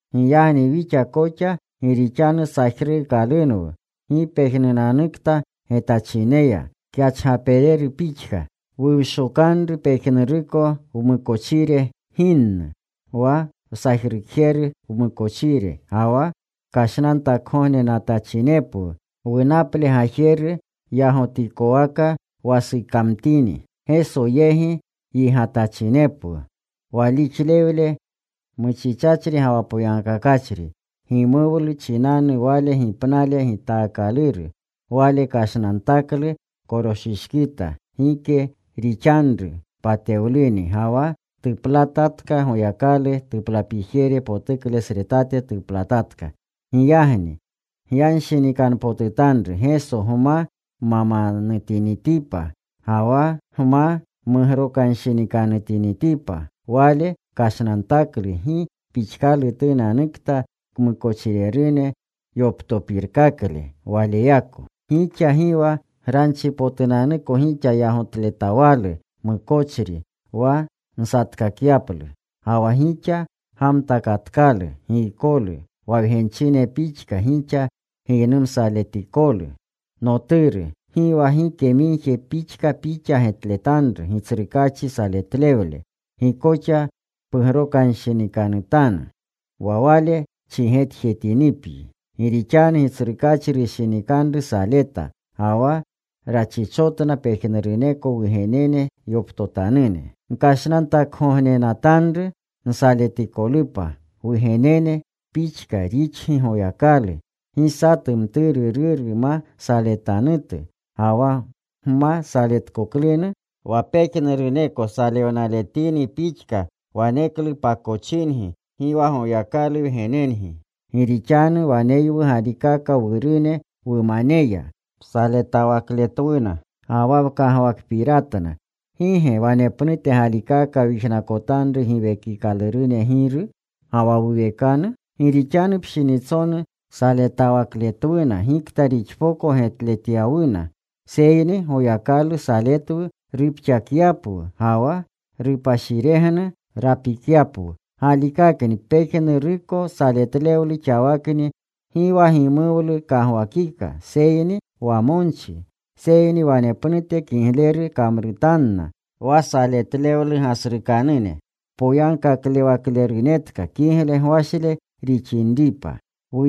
Giyagni wixa koxa gi rixanu sajruukalunwu gi pejnunanukta getachineya kyachgaperu pixka, wuwshokanru pejnuruko wmukochire ginnu, wa wsajrukjeru wmukochire. Ga wa kashnantakgognenatachinepwu, wunaple gajeru yagotikowaka wasukamtini. Geso yegi yigatachinepwu, walixlewle muchichachri ga wa poyagkakachri. Gimuwlu chinanu Wale ginaple gitaakaluru, Wale kashnantaklu koroshishkita. Gike rixanru patewluni. Ga wa tuplatatka. Goyakalu tuplapijere potuklesretate tuplatatka. Giyagni gyanshinikanpotutanru Geso gma mamanutinitipa ga wa gma mugrokanshinikanutinitipa: Wale kashnantaklu gi pixkalutunanukta kmukochirerune yoptopirkakle Waleyako. Gixa gi wa granchipotunanuko gixa yagotletawalu mukochri wa nsatkakyaplu. Ga wa gixa gamtakatkalu giykolu, wa wgenchine pixka gixa giynumsatikolu: Noturu, gi wa gike migje pixka pixa getletanru Gitsrukaachi saletlewle. Gi koxa pugrokanshinikanutanu wa Wale chigetjetinipyi. Gi rixanu Gitsrukaachi rushinikanru saleta. Ga wa rachichotna pejnuruneko wugenene yoptotanune. Gkashnantakgognenatanru nsaletikolupa. Wugenene pixka rixgi Goyakalu. Gi satu mturu ruru ma saletanutu. Ga wa gma saletkoklunu wa pejnuruneko salewnaletini pixka, waneklu pakochingi. Gi wa Goyakalu wgenengi. Gi rixanu waneywu galikaka wurune wumaneya. Saletawakletwuna, ga wa wkagwakpiratna. ¿Gi ge wanepnute galikaka wyijnakotanru giwekikalurune Giru, ga wa wuwekanu? Gi rixanu pshinitsonu saletawakletwuna gikta rixpoko getletyawuna. Seyni Goyakalu saletwu rupxakyapwu ga wa rupashiregnu rapikyapwu. Galikakni pejnuruko saletlewlu xawakni gi wa gimuwlu kagwakika, seyni wamonchi. Seyni wanepnute kigleru kamrutanna wa saletlewlu gasrukanune, kpoyankaklewaklerunetka, kigle gwashle rixinripa.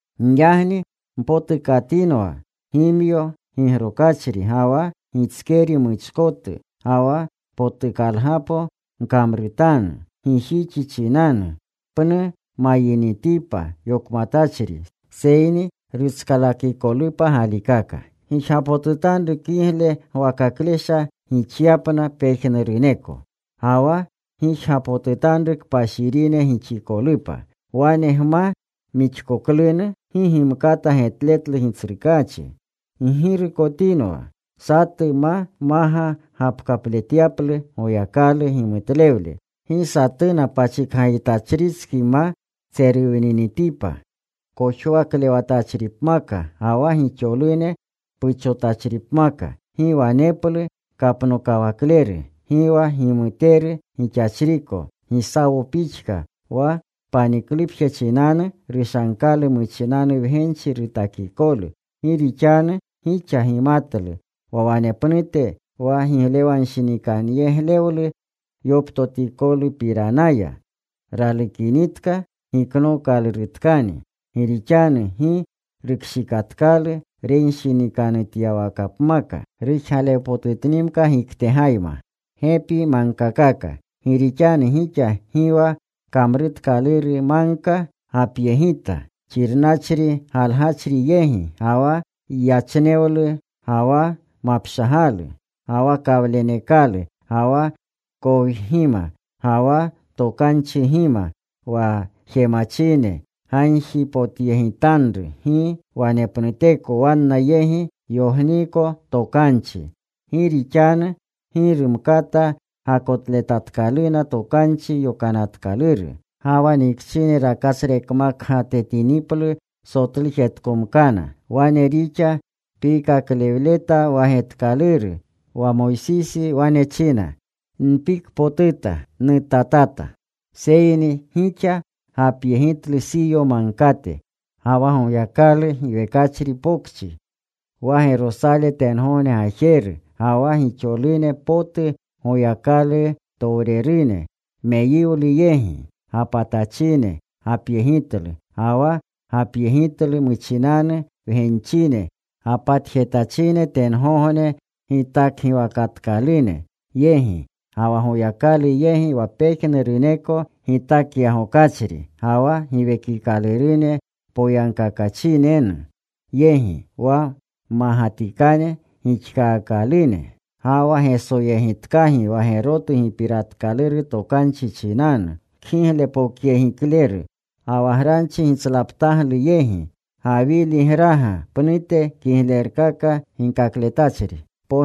Giyagni mpotukatinwa gimyo gigrokachri ga wa gitskeri muchkotu. Ga wa potukgapolu gkamrutanu gijixi chinanu, pnu mayinitipa yokmatachri, seyni rutskalakikolupa galikaka. Gijgapotutanru kigle gwakaklesha gixyapna pejnuruneko. Ga wa gijgapotutanru kpashirine gixikolupa. Wane gma mixkakoklunu, gi gimkata getletlu Gitsrukaachi. Ggirukotinwa satu ma maga gapkapletyaplu Goyakalu gimutlewle. Gi satuna pachikgajitachritski ma tseruwninitipa kojwaklewatachripmaka, ga wa gixolune puchotachripmaka. Gi waneplu kapnokawakleru, gi wa gimuteru gixachriko Gisawo pixka, wa paniklupje chinanu rushagkalu muchinanu wgenchi gitakikolu. Gi rixanu gixa gimatlu wa wanepnute wa giglenshinikanyeglewlu yoptotikolupapiranaya ralukinitka giknookalurutkani. Gi rixanu gi rukshikatkalu renshinikanutyawakapmaka, rujgalewpotutnimka giktegayma. Gi rixanu gixa gi wa kamruukaluru magka gapyegita, xirnachri galgachri yegi, ga wa yachnewlu ga wa mapshagalu, ga wa kawlenekalu, ga wa kowgima, ga wa tokanchigima, wa jemachine gagjipotyegitanru gi wanepnuteko wanna yegi yogniiko tokanchi. Gi rixanu gi rumkata gakotletatkaluna Tokanchi Yokananatkaluru: Ga wa nikchine rakatsrekmagkatetiniplu sotlujetkomkana. Wane rixa piikaklewleta wa getkaluru, wa Moysisi wane china, “Npikpotuta. Nutatata.” Seyni gixa gapyegitlu Siyo Magkate, ga wa Goyakalu giwekachri pokchi, wa Gerosale tengogne gajeru, ga wa gixolurune potu Goyakalutowrerune meyiwlu yegi gapatachine, gapyegitlu. Ga wa gapyegitlu muchinanu wgenchine gapatjetachine tengogne gitakgiwakatkalune yegi. Ga wa Goyakalu yegi wa pejnuruneko Gitakyagokachri, ga wa giwekikaalurune poyagkakachinenu yegi, wa mmagatikane gixkaakalune. Ga wa Gesoyegitkagi wa gerotu Gipiratkaluru Tokanchi chinanu kgiglepokyegikleru, ga wa granchi gitslaptagluyegi, Gawiligraga pnute kiglerkaka ginkakletachri.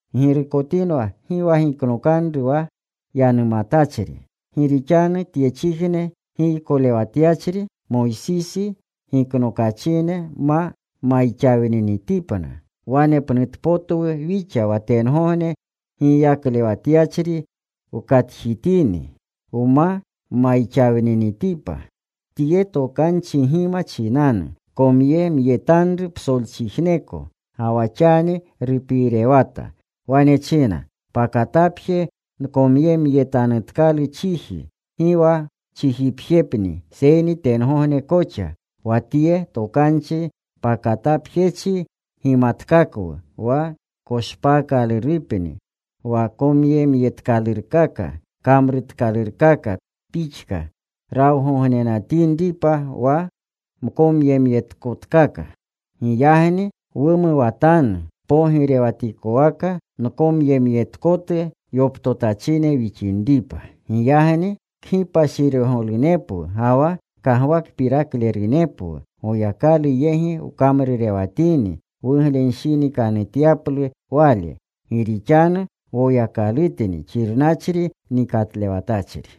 Ggirukotinwa gi wa giknokanru wa Yanumatachri. Gi rixanu tyechijne giykolewatyachri, Moysisi, giknokachine ma mayxawninitipna, wanepnutpotwu wixa wa tengogne Giykolewatyachri wkatjitini, wma mayxawninitipa. Tye tokanchigima muchinanu komyemyetanru psolchijneko. Ga wa xani rupiirewata. Wane china, “Pakatapje nkomyemyetanutkalu chiji. Gi wa chijipjepni seyni tengogne koxa.” Wa tye tokanchi “pakatapjechi” gimatkakwu wa koshpaakalurupni wa komyemyetkalurkaka, kamrutkalurkaka pixka, rawgognenatinripa wa mkomyemyetkotkaka. Giyagni wumuwatanu pogirewatikowaka mkomyemyetkotu yoptotachine wixinripa. Giyagni kgipashiregolunepwu ga wa kagwakpiraklerunepwu, Goyakalu yegi wkamrurewatini wuglenshinikanutyaplu Wale. Gi rixanu Woyakalutni xirnachri nikatlewatachri.